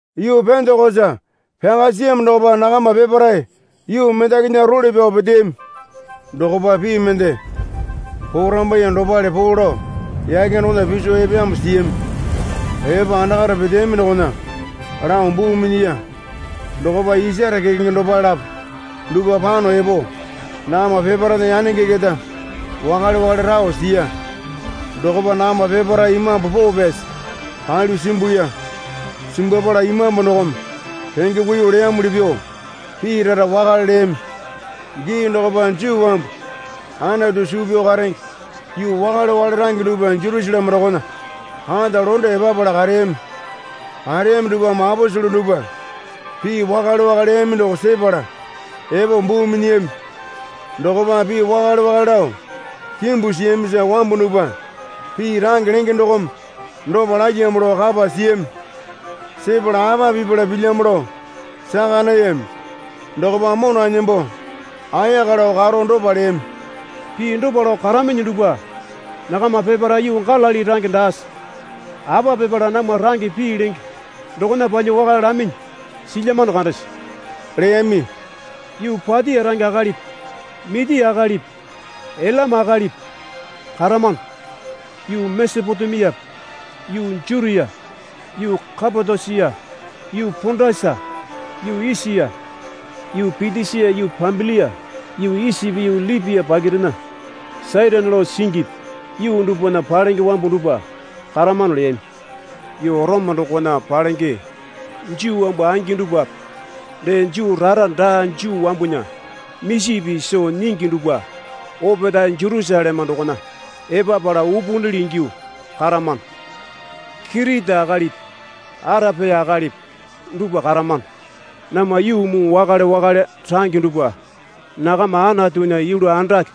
Yuu Pendekosa pyaka siyamo dokopa nakama peparae yuu mendakinya role pyao peteyami. Dokopa pii mende porambaiye dopale poo lao yake dokona piso epeyamo siyami. Epo andakare peteyaminyi dokona lao buu minyiya. Dokopa isare kekenge dopale lapo dupwa pano epo nakama peparaena yanenge keta wakale wakale rao siya. Dokopa nakama peparae Imambu Poo Pyasi palyuo simbuya. Simbwapala Imambu dokome renge kuiyuo leyamuli pyuo pii rara wakale leyami. Gii dokopa Juu wambu Anatu suu pyao karenge yuu wakale wakale range dupwa Jerusaleme dokona kata londe epapala kareyami. Kareyami dupwame aposele dupwa pii wakale wakale leyami doko sepala epo buu minyiyami. Dokopa pii wakale wakale lao kimbu siyamisa wambu dupwa pii range lenge dokome dopa lalyamo lao kapa siyami. Sepala apa pipala pilyamo lao saka nayami. Dokopa mona nembo ayaka lao karo dopa leyami. Pii dopa lao karaminyi dupwa nakama peparae yuu Galili range daase? Apa pipala namwa range pii lenge dokona palyuo wakale laminyi silyamano kandese? leyami. Yuu Patia range akalipi Mitia akalipi Ilama akalipi karamano. Yuu Mesopotemiape yuu Jutia yuu Kapatosia yuu Pondasa yuu Esia yuu Pitisia yuu Pambilia yuu Isipi yuu Lipia pakirena Sairini lao singipi yuu dupwana palenge wambu dupwa karamano leyami. Yuu Orome dokona palenge Juu wambu angi dupwape dee Juu rara daa Juu wambunya misi pii soo nyingi dupwa opetae Jerusaleme dokona epapala upunili ingyuo karamano. Kiriti akalipi Arapia akalipi dupwa karamano. Namwa yuu muu wakale wakale range dupwa nakama Anatunya yulu andake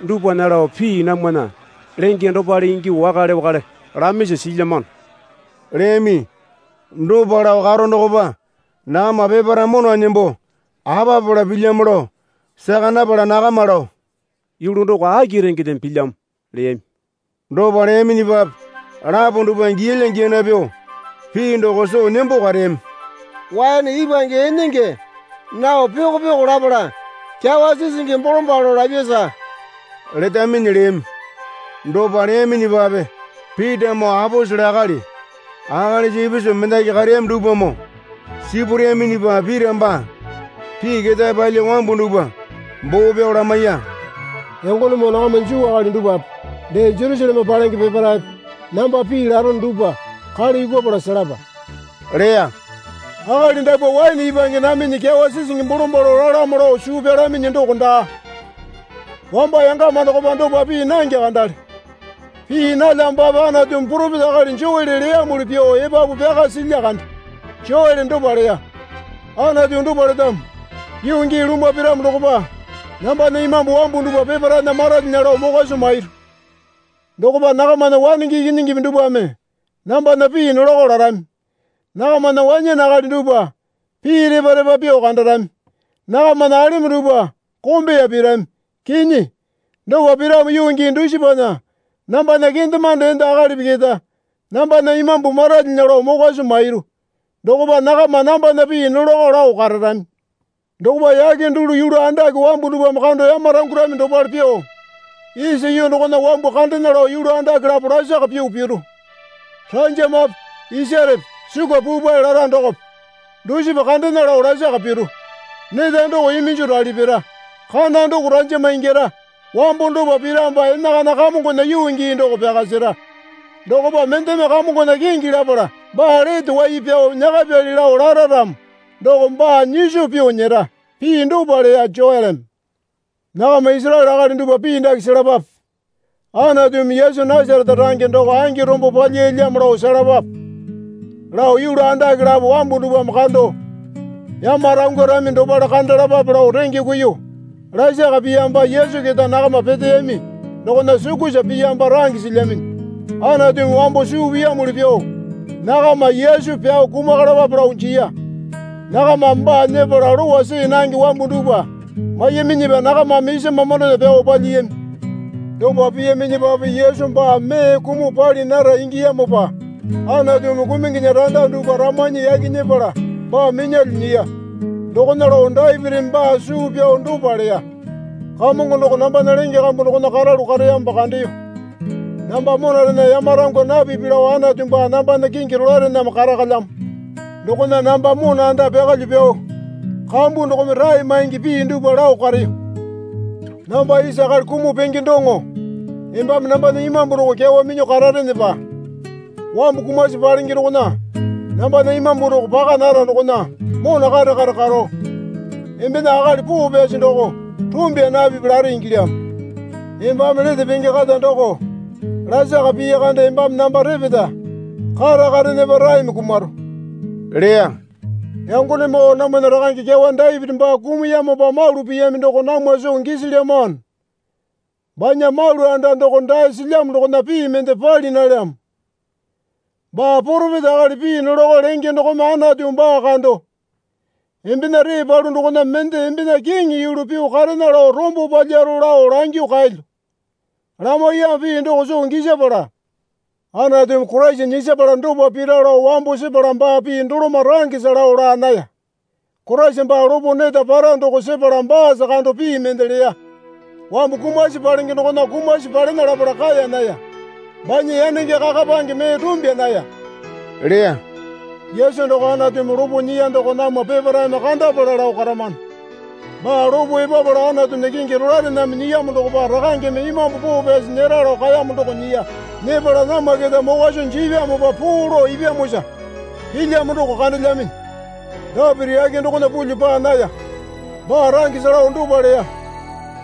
dupwana lao pii namwana lenge dopale ingyuo wakale wakale lamisa silyamano leyami. Dopa lao karo dokopa nakama peparae mona nembo apa pipala pilyamo lao saka napala nakama lao yulu doko aki rengedeme pilyamo? leyami. Dopa leyaminyipape lapo dupwa giyalya giyana pyuo pii doko soo nembo kareyami. Waene ipwange enenge nao pyoko pyoko lapala kyawa sisingi bolombalo lapyasa letaminyi leyami. Dopa leyaminyipape Pitamoo aposele akali akalisa ipisu mendaki kareyami dupwamoo sipureyaminyipa Pita baa pii ketae palyuo wambu dupwa boo pyao lamaiya. Yangonemoo nakama Juu akali dupwape dee Jerusaleme palenge peparaepe namba pii larono dupwa kale yukupala selapa leya. Akali dapwa waene ipwange naminyi kyawa sisingi bolombalo lalamo lao suu pyalaminyi doko daa. Wamba yangama dokopa dopa pii nange kandale. Pii nalyamopape Anatumi poropeta akali Joele leyamuli pyuo epapu pyaka silya kande. Joele dopa leya. Anatu dopa letamo. Yuu gii lumwa piramo dokopa nambana Imambu wambu dupwa peparaena maralyinya lao mokwa soo mairu. Dokopa nakamana wanenge ikinyingipi dupwame nambana pii nolako larami. Nakamana wanyane akali dupwa pii repa repa pyuo kandarami. Nakamana alemo dupwa kombeya pirami. Kinyi, dopa piramo yuu gii dusipana nambana kendemande enda akalipi keta nambana Imambu maralyinya lao mokwa soo mairu. Dokopa nakama nambana pii nolakao lao kararami. Dokopa yake dulu yulu andake wambu dupwame kando yamarangwarami dopale pyuo, isa yuu dokona wambu kandena lao yulu andake lapo lasaka pyuo piru. Ranjamape isarepe sukwa puupae lara dokope dusipa kandena lao lasaka piru. Neta doko iminjo rali pira. Kana doko ranjama ingyara. Wambo dopa piramopa enakana Kamongona yuu gii doko pyaka sera. Dokopa mendeme Kamongona kingi lapala baa lete wai pyao nyakapili lao lara ramo doko, baa nyiso pyuo nyera. Pii dopa leya Joeleme. Nakama Isaraele akali dupwa pii dake selapape. Anatumi Yesu Nasarete range doko angi rombo palyiyalyamo lao selapape lao yulu andake lapo wambu dupwame kando yamarangwarami dopale kandalapape lao renge kuiyuo lasaka piyamopa Yesu keta nakama peteyami dokona sukusa piyamopa range silyaminyi. Anatumi wambo suu piyamuli pyuo nakama Yesu pyao kumakalapape lao jiya. Nakamame baa nyepala lowa see nange wambu dupwa maiyaminyipa nakamame isa mamandona pyao palyiyami. Dopa piyaminyipape Yesu baa mee kumuo pali nara ingiyamopa Anatumi kumunginya randa dupwa ramanyi yaki nyepala baa minyalyuo nyiya. Dokona lao Dapitimi baa suu pyao dopa leya. Kamongo doko nambana lenge kambu dokona karalu kareyamopa kandeyo. Namba monarena yamarangwa napipi lao Anatu baa nambana kingi rolaerename karakalyamo. Dokona namba mona anda pyakalyuo pyao kambu dokome rae maingi pii dupwa lao kareyo. Namba isa akali kumuo penge doŋo embame nambana imambu doko kyawa minyuo kararenepa wambu kumasi palenge dokona nambana imambu doko paka nara dokona mona kare kare karo, embena akali poo pyasi doko rumbya napipi lare ingilyamo. Embame lete penge kata doko lasaka pii kande embame namba repeta karakarenepa raeme kumaro leya. Yangonemoo namwana rakange kyawa Dapiti baa kumuyamopa malu piyami doko namwa soo gisilyamano. Banya malu anda doko dae silyamo dokona pii mende pali nalyamo. Baa poropeta akali pii nolako lenge dokome Anatumi baa kando, Embena ree palu dokona mende embena kiŋi yulu pyuo karena lao rombo palyaro lao langyuo kaelyo, lamaiyamo pii doko soo gisapala Anatumi Koraisa nyisapala dopa pira lao wambo sepala baa pii doloma rangesa lao laa naya. Koraisa baa lopo neta para doko sepala baasa kando pii mende leya. Wambu kumasi palenge dokona kumasi palena lapala kaeya naya. Banya yanenge kakapange mee rumbya naya leya. Yesu doko Anatumi lopo nyiya doko namwa peparaeme kandapala lao karamano. Baa lopo epapala Anatunya kingi rolaerename nyiyamo dokopa Rakangeme Imambu Poo Pyasi nyera lao kaeyamo doko nyiya. Nyepala namwa keta mokwa soo jipyamopa poo lao ipyamosa pilyamo doko kandelyaminyi. Dapiti yake dokona range pulyuo paa naya. Baa rangesa lao dopa leya.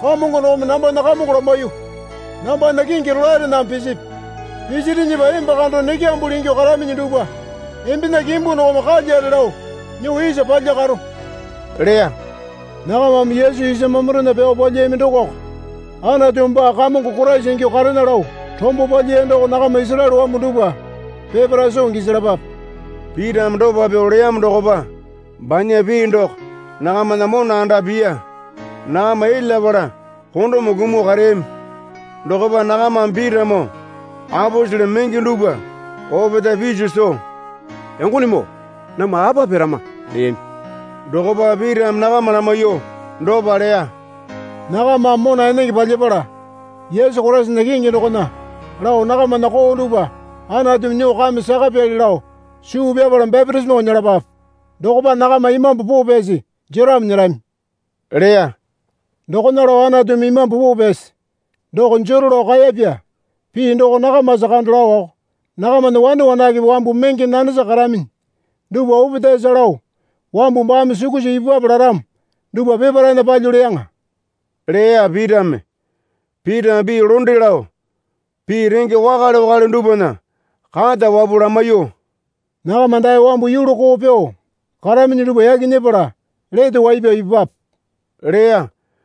Kamongo dokome nambana Kamongo lamaiyuo, Nambana kingi rolaerename pisipi. Pisirinyipa emba kando nekyambuli ingyuo karaminyi dupwa embena kimbu dokome kalyare lao nyuo isa palyakaro, leya. Nakamame Yesu isa mamandona pyao palyiyami dokoko Anatumi baa Kamongo Koraisa ingyuo karena lao rombo palyiya doko nakama Isaraele wambu dupwa peparae soo gisalapape. Pitame dopa pyuo leyamo dokopa banya pii doko nakamana mona anda piya. Nakama elyapala kondome kumuo kareyami. Dokopa nakamame Pitamoo aposele menge dupwa opetae piso soo, Yangonemoo namwa apa pirama? leyami. Dokopa Pitame nakama lamaiyuo dopa leya. Nakamame mona enenge palyapala Yesu Koraisana kingi dokona lao nakamana koo dupwa Anatumi nyuo kame sakapyali lao suu pyapala bapitisimo nyelapape. Dokopa nakama Imambu Poo Pyasi jeramo nyerami leya. Dokona lao Anatumi Imambu Poo Pyasi doko jero lao kaeyapya pii doko nakamasa kando laowako nakamana wane wanakepe wambu menge nanesa karaminyi dupwa opetaesa lao wambu baame sukusa ipupwape laramo dupwa peparaena palyuo leyaŋa, leya Pitame. Pitame pii londe lao pii renge wakale wakale dupwana kata wapuo lamaiyuo, Nakama dae wambu yulu koo pyuo karaminyi dupwa yaki nyepala lete wai pyao ipupwape leya.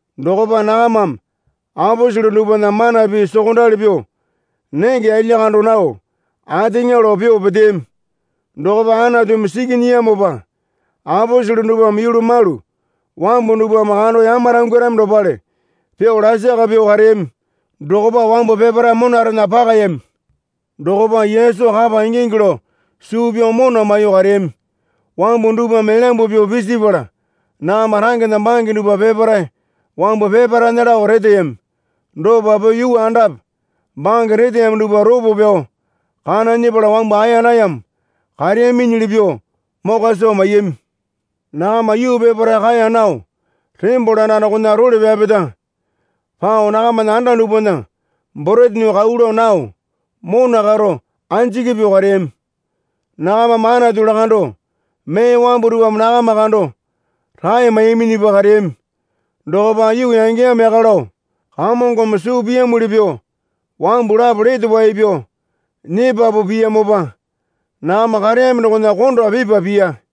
Dokopa nakamame aposele dupwana mana pii sokondali pyuo nenge yalya kando nao ateŋa lao pyuo peteyami. Dokopa Anatumi siki nyiyamopa aposele dupwame yulu malu wambu dupwame kando yamarangwarami dopale pyuo lasaka pyuo kareyami dokopa wambu peparae monarena pakayami. Dokopa Yesu kapa ingingi lao suu pyao mona maiyuo kareyami wambu dupwame elyambu pyuo pisipala nakama rangena bange dupwa peparae wambu peparaena lao reteyami. Dopa pyuo yuu andape bange reteyami dupwa ropo pyao kana nyepala wambu aeya nayamo kareyaminyili pyuo mokwa soo maiyami. Nakama yuu peparae kaeya nao tembole anda dokona role pyapeta pao nakamana anda dupwana borete nyuo kau lao nao mona karo anjiki pyuo kareyami. Nakamame Anatu lakando mee wambu dupwame nakama kando rae maiyaminyipa kareyami. Dokopa yuu yangeyamo yaka lao Kamongome suu piyamuli pyuo wambu lapo lete wai pyao nyepapu piyamopa nakama kareyami dokona konda pipa piya.